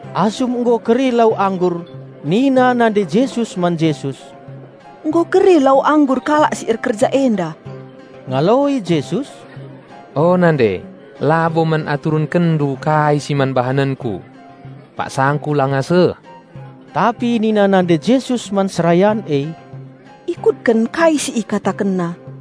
Asum nggo keri lau anggur nina nande Jesus man Jesus, "Nggo keri lau anggur kalak si erkerja enda." Ngaloi Jesus, "O nande, labo man aturenkendu kai si man bahanenKu. PaksangKu langa seh." Tapi nina nande Jesus man serayan e, "Ikutken kai si IkatakenNa."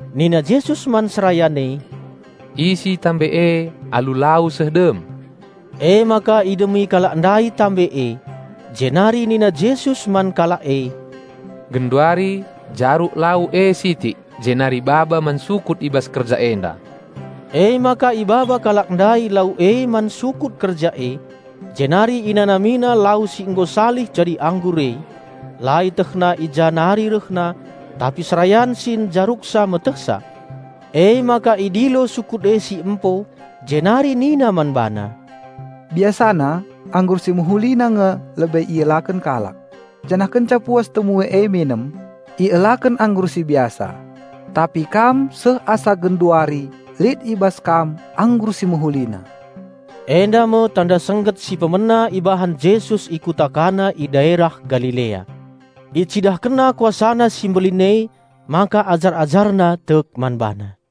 Nina Jesus man serayan e, "Isi guci e alu lau seh dem." Emaka idemi kalak ndai guci e. Jenari nina Jesus man kalak e, "Genduari jaruk lau e sitik jenari baba man sukut i bas kerja enda." Emaka ibaba kalak ndai lau e man sukut kerja e, jenari inanamina lau si nggo salih jadi anggur e. (La ietehna i ja nari rehna; tapi serayan si njaruksa metehsa.) Emaka idilo sukut e si empo, jenari nina man bana, "Biasana anggur si mehulina nge lebe ielaken kalak, janah kenca puas temue e minem, ielaken anggur si biasa. Tapi kam seh asa genduari lit i bas kam anggur si mehulina!" Enda me tanda sengget si pemena ibahan Jesus i kuta Kana i daerah Galilea. IcidahkenNa KuasaNa si mbelin emaka ajar-AjarNa tek man BaNa.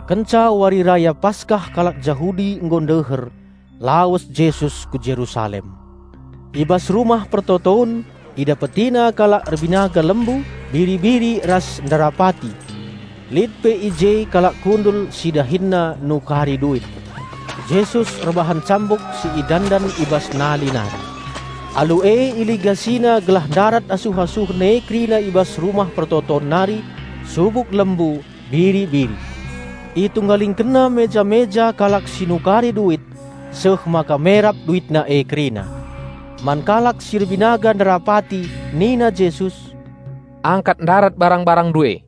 Kenca Wari Raya Paskah kalak Jahudi nggo ndeher, lawes Jesus ku Jerusalem. I bas Rumah Pertoton IdapetiNa kalak erbinaga lembu, biri-biri ras nderapati. Lit pe i je kalak kundul si dahinna nukari duit. Jesus erbahan cambuk si idandan i bas nali nari. Alu e IligasiNa gelah ndarat asuh-asuhen e kerina i bas Rumah Peroton nari: subuk lembu, biri-biri. ItunggalingkenNa meja-meja kalak si nukari duit, seh maka merap duitna e kerina. Man kalak si erbinaga nderapati nina Jesus, "Angkat ndarat barang-barangndu e!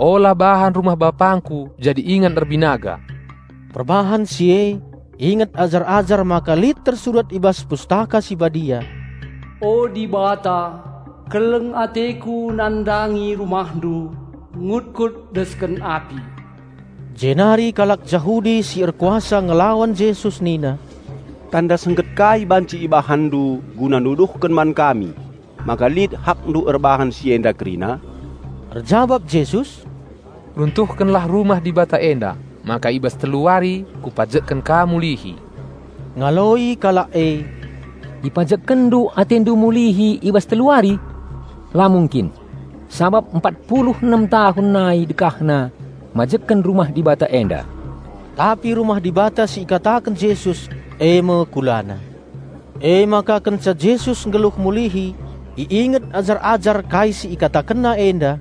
Ola bahan rumah BapangKu jadi ingan erbinaga!" Perbahan si e inget ajar-ajar maka lit tersurat i bas Pustaka Si Badia, "O Dibata, keleng-ateKu nandangi RumahNdu, ngutkut desken api." Jenari kalak Jahudi si erkuasa ngelawan Jesus nina, "Tanda sengget kai banci IbahanNdu guna nuduhken man kami maka lit HakNdu erbahan si enda kerina?" Erjabap Jesus, "Runtuhkenlah rumah Dibata enda, maka i bas telu wari Kupajekken ka mulihi." Ngaloi kalak e, "IpajekkenNdu AteNdu mulihi i bas telu wari? La mungkin, sabap empat pulu enem tahun nai dekahna majekken Rumah Dibata enda!" Tapi Rumah Dibata si ikataken Jesus, e me KulaNa. Emaka kenca Jesus nggeluh mulihi, iinget ajar-ajar kai si IkatakenNa enda;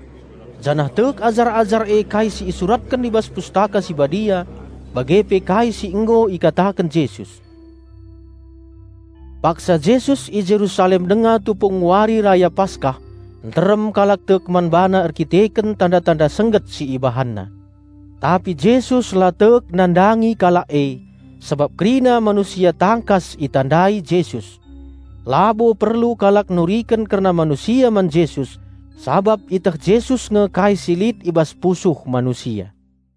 janah tek ajar-ajar e kai si isuratken i bas Pustaka Si Badia bage pe kai si nggo ikataken Jesus. Paksa Jesus i Jerusalem denga tupung Wari Raya Paskah, nterem kalak tek man BaNa erdandanken tanda-tanda sengget si IbahanNa. Tapi Jesus la tek nandangi kalak e, sabap kerina manusia tangkas itandai Jesus. Labo perlu kalak nuriken kerna manusia man Jesus sabap ieteh Jesus nge kai si lit i bas pusuh manusia.